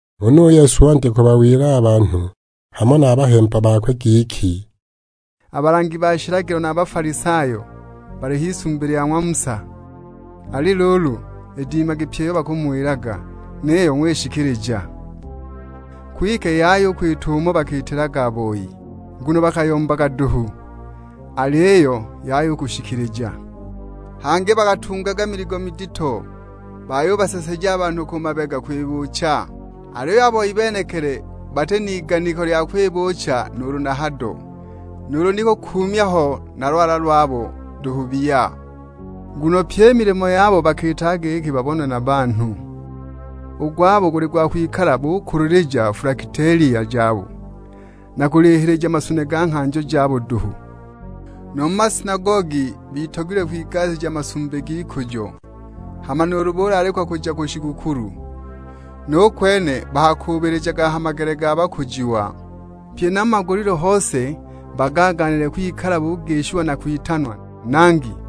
Huna u Yesu wandya kubawila a banhu hamo na a bahemba bakwe giki, "A balangi ba shilagilo na a Bafalisayo, bali h'isumbi lya ng'wa Musa. Ali luulu, idimagi pyi iyo bakamuwilaga, niyo g'wishikilija. Kwike yaya u kwita umo bakiitilaga a boi, nguno bakayombaga duhu, aliyo yaya u kushikilija. Hangi bakatungaga miligo midito bayubaseseja a banhu ku mabega kwibuucha, aliyo a boi benekili bati n'iganiko lya kwibuucha nuulu hado; nuulu ni kukuumya ho na lwala lwabo duhu biya. Nguno pyi i milimo yabo bakiitaga giki babonwe na banhu; u gwabo guli gwa kwikala bukulilija fulakitelia jabo, na kulihilija masune ga nghanjo jabo duhu. Nu mu masinagogi batogilwe kwigasija masumbi g'ikujo; hama nuulu bulaalikwa kuja ku shigukulu, nu kwene bakakuubilijaga ha magele ga bakujiwa. Pye na mu magulilu hose bagaagaanile kwikala bugishiwa na kwitanwa, 'Nangi!'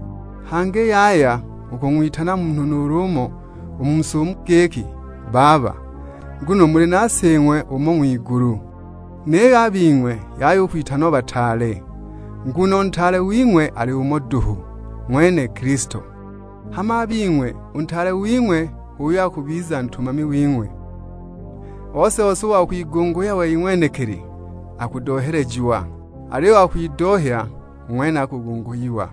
Hangi yaya u kung'witana munhu nuulu umo u mu si umu giki, 'Baba,' nguno muli na Sing'we umo ng'wigulu. Niyo a bing'we yaya u kwitanwa 'Bataale,' nguno u Ntaale wing'we ali umo duhu, ng'wene Kilisto. Hama a bing'we u ntaale wing'we h'uyo akubiza ntumami wing'we. Ose-ose u wa kwigunguhya wei ng'wenekili, akudohelejiwa, aliyo u wa kwidohya, u ng'wene akugunguhiwa."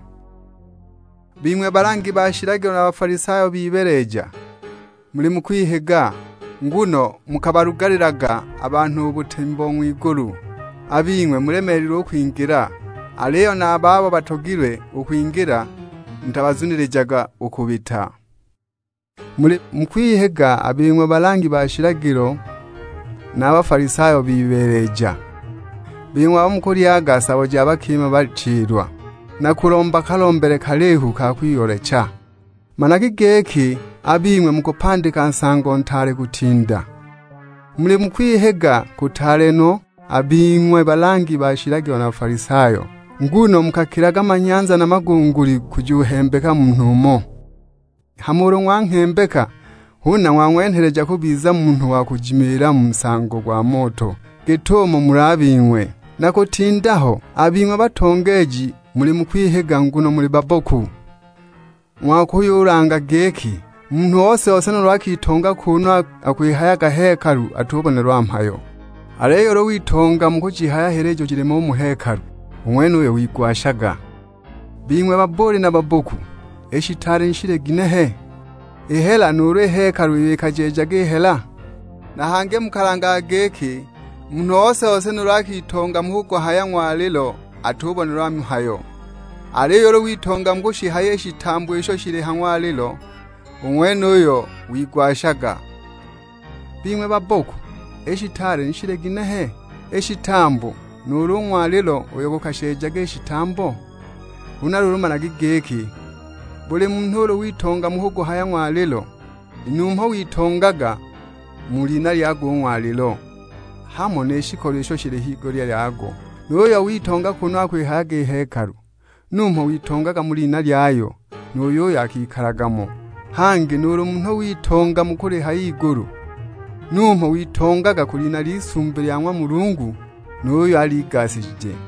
"Bing'we balangi ba shilagilo na Bafalisayo bibeeleja, muli mu kwihiga; nguno mukabalugalilaga a banhu u butemi bo ng'wigulu. A bing'we mulemeelilwe u kwingila, aliyo na a babo batogilwe u kwingila mutabazunilijaga u kubita! [ Muli mu kwihiga a bing'we balangi ba shilagilo na Bafalisayo bibeeleja, bing'we abo mukalyaga sabo ja bakima bachilwa, na kulomba kalombele kalihu ka kwiyoolecha; managi giki a bing'we mukupandika nsango ntaale kutinda!] Muli mu kwihiga kutaale no a bing'we balangi ba shilagilo na Bafalisayo, nguno mukakilaga manyanza na magunguli kujuhembeka munhu umo; hama ulu ng'wanghembeka huna ng'wang'wenheleja kubiza munhu wa kujimilila mu nsango gwa moto git'umo muli a bing'we, na kutinda ho! A bing'we batongeeji muli mu kwihiga, nguno muli babboku: ng'wakuyulanga giki, 'Munhu ose-ose nuulu akitonga kunu akwihayaga hekalu atubonelwa mhayo, aliyo ulu witonga mu kujihaya hela ijo jilimo u mu hekalu, u ng'wenuyo wigwashaga!' Bing'we babbuuli na babboku, i shitaale ni shili ginehe? I hela, nuulu i hekalu iyo ikajeejaga i hela? Na hangi mukalangaga giki, 'Munhu ose-ose nuulu akitonga mu kuguhaya ng'walilo atubonelwa mhayo, aliyo ulu witonga mu kushihaya i shitambo isho shili a ha ng'walilo, u ng'wenuyo wigwashaga!' Bing'we babboku, i shitaale ni shili ginehe? I shitambo, nuulu u ng'walilo uyo gukasheejaga i shitambo? Huna luulu managi giki, buli munhu ulu witonga mu kuguhaya ng'walilo, numho witongaga mu lina lyago u ng'walilo, hamo ni shikolo isho shili higulya yago. Nu yuyo witonga kunu akwihayaga hekalu, numho witongaga mu lina lyayo, nu yuyo akikalaga mo. Hangi nuulu munhu witonga mu kulihaya igulu, numho witongaga ku lina ly'isumbi lya ng'wa Mulungu, nu yuyo aligasigije.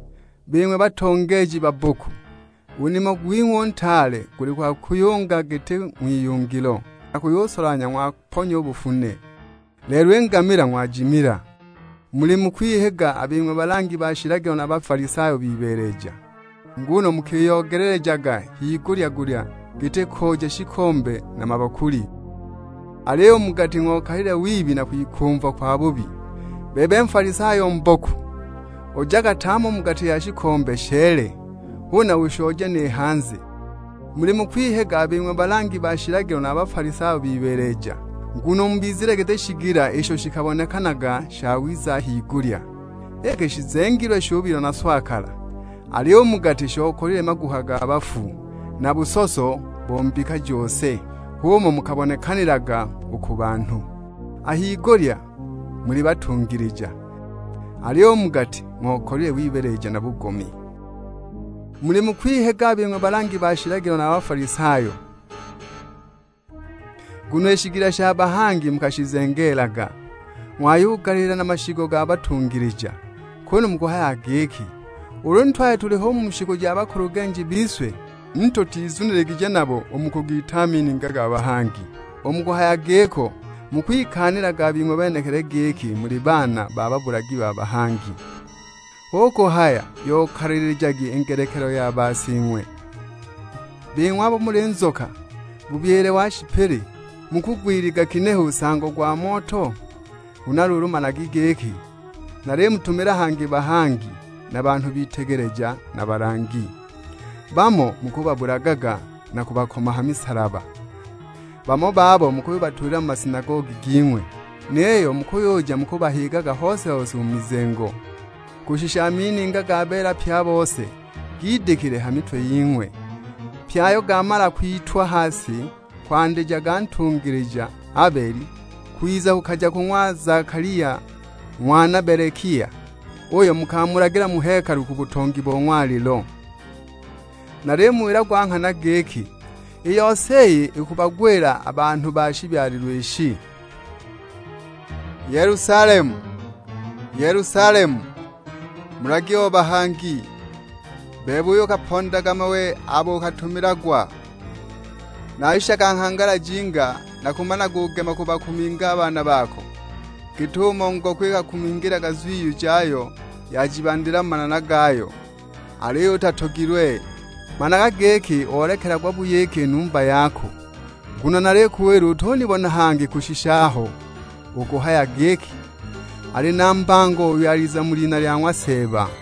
Bing'we batongeeji babboku, u nimo gwing'we u ntaale guli gwa kuyunga giti ng'wiyungilo, na kuyusolanhya, ng'waponya u bufune, lelo i ngamila ng'wajimila! Muli mu kwihiga a bing'we balangi ba shilagilo na Bafalisayo bibeeleja, nguno mukiyoogelelejaga higulya-gulya giti kooja shikombe na mabakuli, aliyo u mu gati ng'okalile wibi na kwikumva kwabubi. Bebe Nfalisayo mboku, ojaga tame u mu gati ya shikombe sheele, huna ushooje ni hanze! Muli mu kwihiga a bing'we balangi ba shilagilo na Bafalisayo bibeeleja, nguno mubizile giti shigila isho shikabonekanaga shawiza a higulya, iki shizengeelilwe shubilwa na swakala, aliyo u mu gati shokalile maguha ga bafu, na busoso bo mbika jose! H'umo mukabonekanilaga u ku banhu; a higulya muli batungilija, aliyo u mu gati ng'okalile wibeeleja na bugomi!" "Muli mu kwihiga a bing'we balangi ba shilagilo na Bafalisayo, nguno i shigila sha bahangi mukashizengeelaga, ng'wayugaliila na mashigo ga batungilija. Kunu mukuhayaga giki, 'Ulu ni twali tuliho u mu shiku ja bakulugenji bise, ni tutizuniligije nabo u mu kugiita a mininga ga bahangi!' U mu kuhaya giko, mukwikaanilaga bing'we benekili giki muli baana ba babulagi ba bahangi. Hu kuhaya yokalilijagi i ngelekelo ya basing'we. Bing'we abo muli nzoka, na bubyile wa shipili, mukugwiliga ginehe u nsango gwa moto? Huna luulu managi giki, nalimutumila hangi bahangi, na banhu bitegeleja na balangi, bamo mukubabulaga na kubakoma ha misalaba, bamo babo mukuyubatulila mu masinagogi ging'we; niyo mukuyuja mukubahigaga hose-hose u mu mizengo. Kushisha a mininga ga beela pye a bose gidikile ha mitwe ying'we; pye ayo gaamala kwitwa ha si, kwandija ga ntungilija Abeli, kwiza kukaja ku ga ng'wa Zakalia ng'wana Belekia, uyo mukamulagila mu hekalu ku butongi bo ng'walilo. Nalimuwila gwa nghana giki, i yose iyi ikubagwila a banhu ba shibyalilwe ishi." "Yelusalemu, Yelusalemu, mulagi o bahangi; bebe uyo ukabapondaga mawe abo ukatumilagwa. Nashishaga nghangala jinga nakumanagugema kubakuminga a baana bako, git'umo ngoko ikakumingilaga zwiyu jayo yajibandila mu manana gayo; aliyo utatogilwe! Managa giki olekelagwa buyiki i numba yako! Nguno nalikuwila utunibona hangi kushisha aho ukuhaya giki, 'Ali na mbango uyo aliza mu lina lya ng'wa Seeba!' "